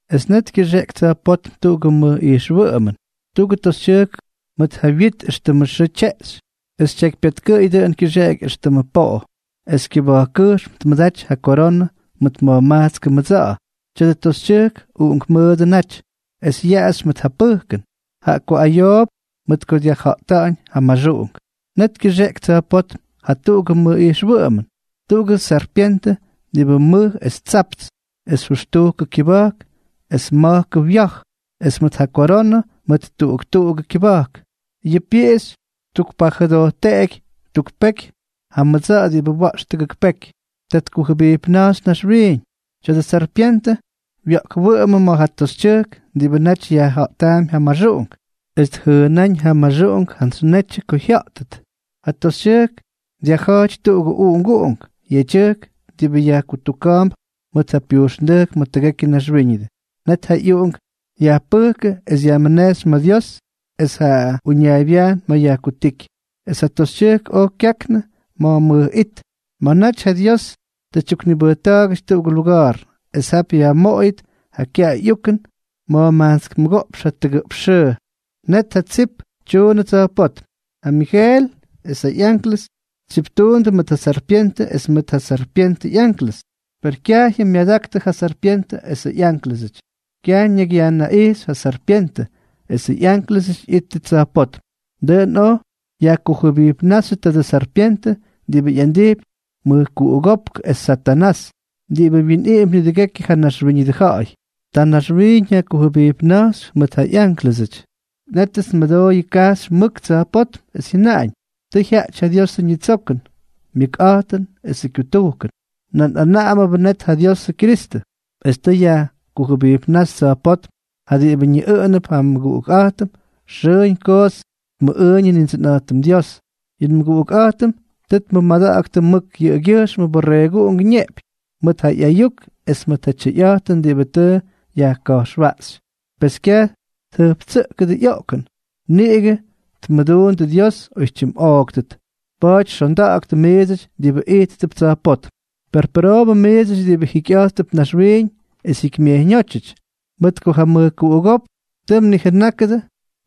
Es net kyʉxeꞌky tsa̱jpótm tuꞌugʉ mʉj ijxwʉꞌʉmʉn: tuꞌugʉ toxytyʉjk mʉt ja wyit éxtʉmʉ xʉʉ tyeꞌxy, es tyekypyatkʉꞌʉy dʉꞌʉn kyʉxeꞌeky éxtʉmʉ poꞌo, es kyʉba̱jkkʉjxm tmʉdaty ja koronʉ mʉt ma̱jmajtskʉ mʉdsa̱ꞌa̱. Tya̱dʉ toxytyʉjk uꞌunkmʉʉdʉ naty, es yaꞌaxy mʉt ja pʉjkʉn, jaꞌa ko ayoop mʉt ko dyajja̱ꞌta̱ꞌa̱ñ ja maxuꞌunk. Net kyʉxeꞌky tsa̱jpótm jatuꞌugʉ mʉj ijxwʉꞌʉmʉn: tuꞌugʉ sarpyentʉ diꞌibʉ mʉj es tsapts, es jʉxtujkʉ kyʉba̱jk es ma̱jkʉ wya̱j, es mʉt ja koronʉ ma̱ tuꞌuk tuꞌugʉ kyʉba̱jk. Yʉ pyiꞌixy ttukpajʉdojteꞌky tuk peky ja mʉdsa̱ꞌa̱ diꞌibʉ wa̱ꞌx tʉgʉk peky. Ta tkujʉbijpna̱jxy naxwiiñ. Tya̱dʉ sarpyentʉ wya̱ꞌkwʉꞌʉmʉ ma̱ ja toxytyʉjk diꞌibʉ naty yajja̱ꞌtaampy ja maxuꞌunk, es tjʉʉna̱ꞌa̱ñ ja maxuꞌunk jantsy netyʉ ko jya̱ꞌtʉt. Ja toxytyʉjk dyajja̱jty tuꞌugʉ uꞌunguꞌunk yedyʉjk diꞌibʉ yajkutuka̱a̱mp mʉt ja pyujxnda̱jk ma̱ tʉgekyʉ naxwíñʉdʉ. Net ja ꞌyuꞌunk yajpʉjkʉ es yajmʉnejxy ma̱ Dios es ja uñaaybyajn ma̱ yajkutíky. Es ja toxytyʉjk oj kyaknʉ ma̱ mʉj it, ma̱ naty ja Dios tʉ tyuknibʉjta̱a̱gʉty tuꞌugʉ luga̱a̱r. Es jap yajmoꞌoyʉt ja kyaꞌay ꞌyukʉn ma̱jmajtsk mʉgoꞌpx jatʉgʉꞌpx xʉʉ. Net ja tsip tyuunʉ tsa̱jpótm: ja Migel es ja ꞌyanklʉs tsiptuundʉ mʉt ja sarpyentʉ es mʉt ja sarpyentʉ ꞌyanklʉs. Per kyajyʉm myadaktʉ ja sarpyentʉ esʉ ꞌyanklʉs, kyaj ñakyyajnaꞌijxy ja sarpyentʉ esʉ ꞌyánklʉsʉty ꞌyítʉt tsa̱jpótm. Dʉꞌʉn oj yajkujʉbijpnáxyʉ tadʉ sarpyentʉ, diꞌibʉ ꞌyandijpy mʉjkuꞌugópk es Satanás, diꞌibʉ wyinꞌiꞌimpy nidʉgekyʉ ja naxwíñʉdʉ ja̱ꞌa̱y. Ta naxwiiñ yajkujʉbijpna̱jx mʉt ja ꞌyánklʉsʉty. Nétʉts nmʉdooy kajxy mʉk tsa̱jpótm, es jyʉnaꞌañ: —Tʉ jyaꞌty ja Diosʉ ñitsokʉn, myʉkꞌa̱jtʉn esʉ kyutujkʉn. Nan anaꞌamnʉbʉ net ja Diosʉ Kyristʉ, es tʉ yajkujʉbijpnáxy tsa̱jpótm ja diꞌibʉ ñiꞌʉꞌʉnʉp ja nmʉguꞌukꞌa̱jtʉm. Xʉʉñ koots tmʉꞌʉʉñʉ Nindsʉnꞌa̱jtʉm Dios. Yʉ nmʉguꞌukꞌa̱jtʉm tʉ tmʉmada̱ꞌa̱ktʉ mʉt yʉꞌʉgyʉjxmʉ Borreeguꞌungʉ ñeꞌpyñ, mʉt ja ꞌyayuk es mʉt ja tyʉyꞌa̱jtʉn diꞌibʉ tʉ yajka̱jxwaꞌxy. Pes kyaj tjʉjptsʉꞌkʉdʉ ꞌyoꞌkʉn, niꞌigʉ tmʉdundʉ Dios oytyimꞌooktʉt. Pa̱a̱ty xonda̱ꞌa̱ktʉ miidsʉty diꞌibʉ ijttʉp tsa̱jpótm. Per pʉroobʉ miidsʉty diꞌibʉ jikyꞌa̱jttʉp naxwiiñ es jikymyejyñóty, mʉt ko ja mʉjkuꞌugópk tʉ mnijʉnákʉdʉ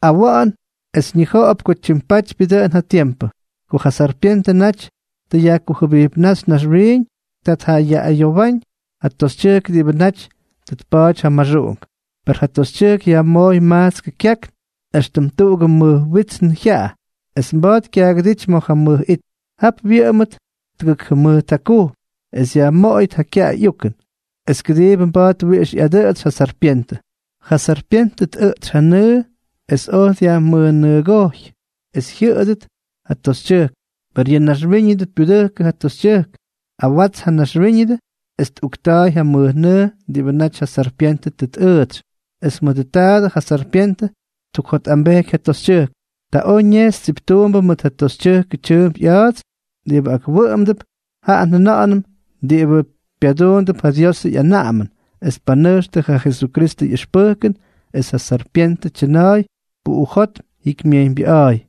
awa̱ꞌa̱n es ñija̱ꞌa̱p ko tyimpatypyʉ dʉꞌʉn ja tiempʉ. Ko ja sarpyentʉ naty tʉ yajkujʉbijpnáxy naxwiiñ, ta tjayaꞌꞌayowáñ ja toxytyʉjk diꞌibʉ naty tʉ tpa̱a̱ty ja maxuꞌunk. Per ja toxytyʉjk yajmooy majtskʉ kyakn éxtʉm tuꞌugʉ mʉj witsnʉ jyaꞌa, es mba̱a̱t kyaagʉdíty ma̱ ja mʉj it. Jap wyʉꞌʉmʉt tʉgʉk jʉmʉjt jakujm, es yajmoꞌoyʉt ja kyaꞌay ꞌyukʉn, es kʉdiibʉ mba̱a̱t wiꞌix ꞌyadʉꞌʉtsy ja sarpyentʉ. Ja sarpyentʉ tꞌʉꞌtsy ja nʉʉ, es oj dyajmʉjnʉʉgojy es jyʉꞌʉdʉt ja toxytyʉjk. Per yʉ naxwíñʉdʉ pyudʉjkʉ ja toxytyʉjk, awats ja naxwíñʉdʉ es tꞌukta̱a̱y ja mʉjnʉʉ diꞌibʉ naty ja sarpyentʉ tʉ tꞌʉʉtsy. Es mʉdʉ taadʉ ja sarpyentʉ ttukjotꞌambejky ja toxytyʉjk. Ta oj ñejxy tsiptuumbʉ mʉt ja toxytyʉjkʉ tyʉʉmp ꞌya̱a̱ts diꞌibʉ akwʉꞌʉmdʉp, jaꞌa njʉna̱ꞌa̱nʉm diꞌibʉ pyaduundʉp ja Diosʉ ꞌyanaꞌamʉn es tpanʉjxtʉ ja Jesukristʉ ꞌyʉxpʉjkʉn. Es ja sarpyentʉ tyʉna̱a̱y puꞌujótm jikymyejyñbyʉꞌa̱a̱y.